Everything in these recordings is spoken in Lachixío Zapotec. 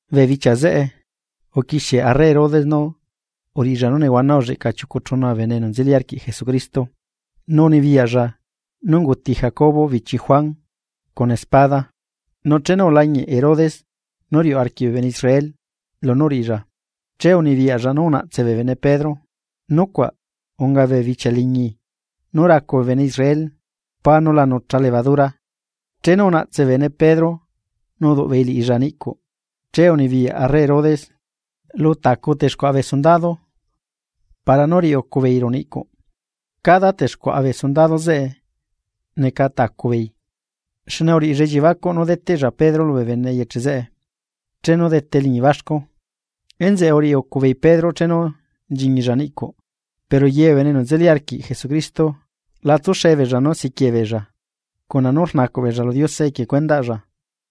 Bee bichia zeꞌe uquixie arre Herodes nú uriꞌilla nú nehuana ulleꞌca chiucu chuna bee bene enu nzeli arquiꞌ Jesucristo. Nu unibiyaꞌlla nú unguti Jacobo bichi Juan cuna espada. Nu chenu ulañiꞌ Herodes nú riuꞌ arquiꞌ bee bene Israel lunú uriꞌilla, che unibiyaꞌlla nú unaꞌtse bee bene Pedro. Nucuaꞌ unga bee bichia liñi nú racu bee bene Israel pá nú la nucha levadura. Chenu unaꞌtse bee bene Pedro nu uduꞌ beei liꞌilla niꞌcuꞌ. Che unibiyaꞌ arre Herodes lu tacu texcuaꞌa bee sundado para nú riꞌi ucu beei ruꞌu niꞌcuꞌ, cada texcuaꞌa bee sundado zeꞌe neca tacu beei. Xne uriꞌilla elliebacuꞌ nú deteꞌlla Pedro lubee bene eyeche zeꞌe chenu dete eliñi baxcu. Enzeꞌe uriꞌi ucu beei Pedro chenu nchiñilla niꞌcuꞌ, pero ye bee bene enu nzeli arquiꞌ Jesucristo la tsuxe beella nú siquiee beella, cuna nú rnacuꞌ beella lu Diose equie cuendaꞌlla.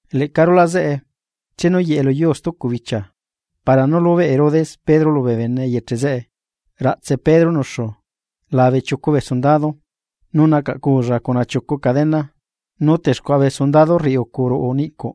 Leꞌca rulaꞌ zeꞌe chenu uyeꞌe luyuu stucu bichia para nú lubeꞌ Herodes Pedro lubee bene eyeche zeꞌe, raꞌtse Pedro nuxu labe chiucu bee sundado, nu nacaꞌculla cuna chiucu cadena, nu texcuaꞌa bee sundado rriucu ruꞌu niꞌcuꞌ.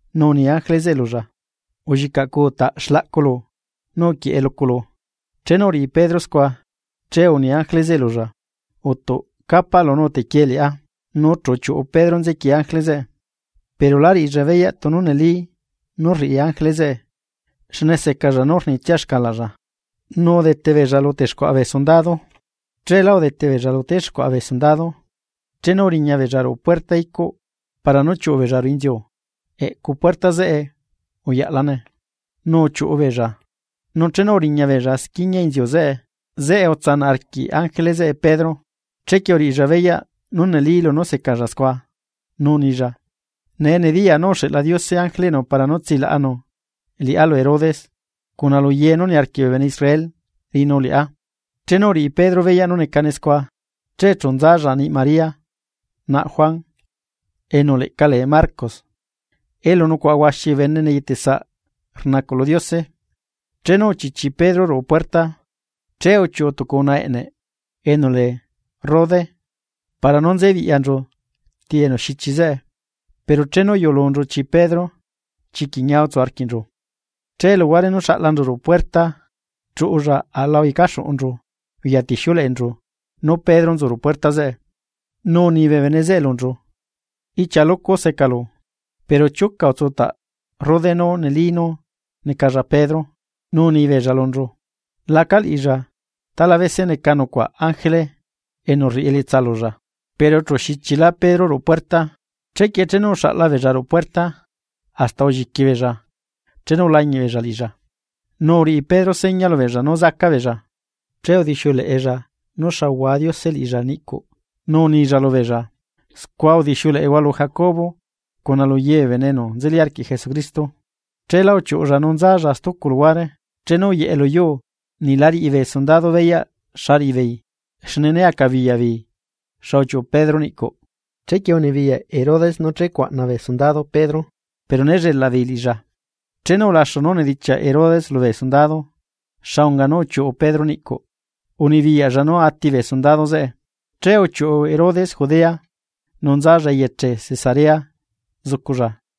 Nu uni ángele zeꞌe lulla: ―Ulliꞌcacuutaꞌ xlaꞌculu nu uquieꞌe luculu. Chenu uriꞌi Pedro scua, che uni ángele zeꞌe lulla: ―Uꞌtuꞌ capaꞌlu nu utequiee liꞌá. Nu chu uchiuꞌu Pedro nzequiee ángele zeꞌe, pero la riꞌilla beyaꞌ tunu neli nú rriꞌi ángele zeꞌe. Xne secalla nú rnitsia xcalaꞌlla. Nu udete beella lu texcuaꞌa bee sundado, cheelá udete beella lu texcuaꞌa bee sundado, chenu uriñabeella ruꞌu puerta niꞌcuꞌ para nú chiuꞌu beella ruꞌu inziu, eꞌcu puerta zeꞌe uyaꞌlane. Nu uchiuꞌu beella, nu chenu uriñabeella squiña inziu zeꞌe, zeꞌe utsanaꞌ arquiꞌ ángele zeꞌe Pedro. Chequie uriꞌilla beyaꞌ nú neli lunú secalla scua, nu unilla: ―Nee nediyaa nú uxeꞌla Diose ángeleꞌnu para nú utsilaꞌanu liꞌá lu Herodes, cuna lu ye nú niarquiꞌ bee bene Israel riꞌinu liꞌá. Chenu uriꞌi Pedro beyaꞌ nú necane scua, che chu nzalla niꞌ María, naꞌ Juan, enu leꞌca lee Marcos, elu nucuaꞌa huaxi bee bene neyeteꞌ saꞌ rnacuꞌ lu Diose. Chenu uchichi Pedro ruꞌu puerta, che uchiuꞌu tucu unaꞌa eꞌne enu lee Rode para nú nzebiꞌyanchu ti enu xichi zeꞌe. Pero chenu uyulunchu chi Pedro, chiquiꞌ ñia utsu arquiꞌnchu, che luhuare nú xaꞌlanchu ruꞌu puerta chuꞌulla aꞌla uyecaxuꞌunchu uya tixiuleꞌenchu nú Pedro nzu ruꞌu puerta. Nu uni bee bene zeꞌe lunchu: ―¡Ichia lucu secalu! Pero chiuca utsutaꞌ Rode nú neli nú necalla Pedro. Nu uni beella lunchu: ―Laca liꞌilla, talabese neca nucuaꞌ ángele enu rriꞌi elietsa lulla. Pero chu xichila Pedro ruꞌu puerta, chequie chenu uxaꞌla beella ruꞌu puerta, hasta ulliqui beella chenu ulañiꞌbeella liꞌilla. Nu uriꞌi Pedro seña lubeella nú zaca beella, che udixiuleꞌella nú xa uhua Diose liꞌilla niꞌcuꞌ, nu unilla lubeella: ―Scua udixiuleꞌehua lu Jacobo, cuna lu ye bee bene enu nzeli arquiꞌ Jesucristo. Cheelá uchiuꞌulla nu nzalla stucu luhuare. Chenu uyeꞌe luyuu, niꞌ la riꞌi bee sundado beyaꞌ xa riꞌibeei xne né acabiyaꞌ beei xa uchiuꞌu Pedro niꞌcuꞌ. Chequie unibiyaꞌ Herodes nú checuaꞌna bee sundado Pedro, pero ne llelaꞌ beei liꞌilla. Chenu ulaxu nú unidichiaꞌ Herodes lubee sundado xa unga nú uchiuꞌu Pedro niꞌcuꞌ, unibiyaꞌlla nú ati bee sundado zeꞌe. Che uchiuꞌu Herodes Judea nu nzalla eyeche Cesarea zuculla.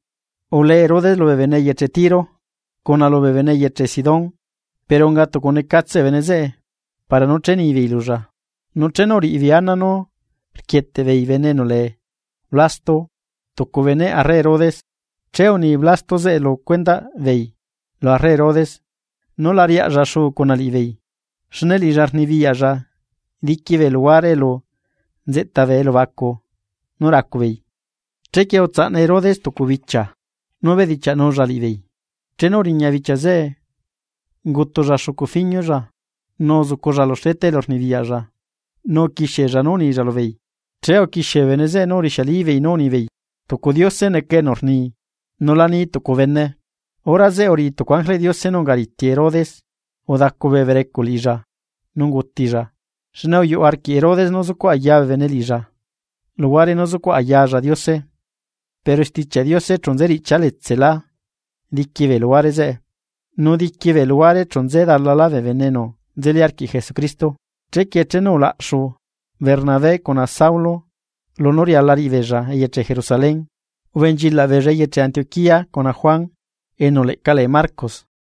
Ulee Herodes lubee bene eyeche Tiro cuna lubee bene eyeche Sidón, pero unga tucu necatse bee bene zeꞌe para nú che nibeei lulla. Nu chenu uriꞌibeei ana nú rquieteꞌ beei bene enu lee Blasto, tucu beneꞌ arre Herodes, che uni Blasto zeꞌe lu cuendaꞌ beei lu arre Herodes nú la riaꞌlla xu cuna liꞌibeei, xne liꞌilla rnibiyaꞌlla diqui bee luhuare elu nzeꞌta bee elubacu nú racubeei. Chequie utsaꞌna Herodes tucu bichia nú bedichiaꞌnulla liꞌibeei, chenu uriña bichia zeꞌe ungutulla xucu fiñulla, nu uzuculla lu xleta elu rnibiyaꞌlla nu uquixiella nú unilla lubeei. Che uquixie bee bene zeꞌe nú urixialibeei nú unibeei: ―¡Tucu diose neca enu rni, nu la ni tucu bene! Hora zeꞌe uriꞌi tucu ángeleꞌ Diose nú unga riti Herodes, udacu bee berecuꞌ liꞌilla nu ungutilla. Xne uyuꞌu arquiꞌ Herodes nú zucuꞌ ayaa bee bene liꞌilla, luhuare nú zucuꞌ ayaalla Diose. Pero Stichiaꞌ Diose chu nze riꞌchia letsela diqui bee luhuare, nu diqui bee luhuare chu nze dalalá bee bene enu nzeli arquiꞌ Jesucristo. Chequie chenu ulaꞌxu Bernabé cuna Saulo lunú riala riꞌibeella eyeche Jerusalén, ubenchilaꞌ beella eyeche Antioquía cuna Juan, enu leꞌca lee Marcos.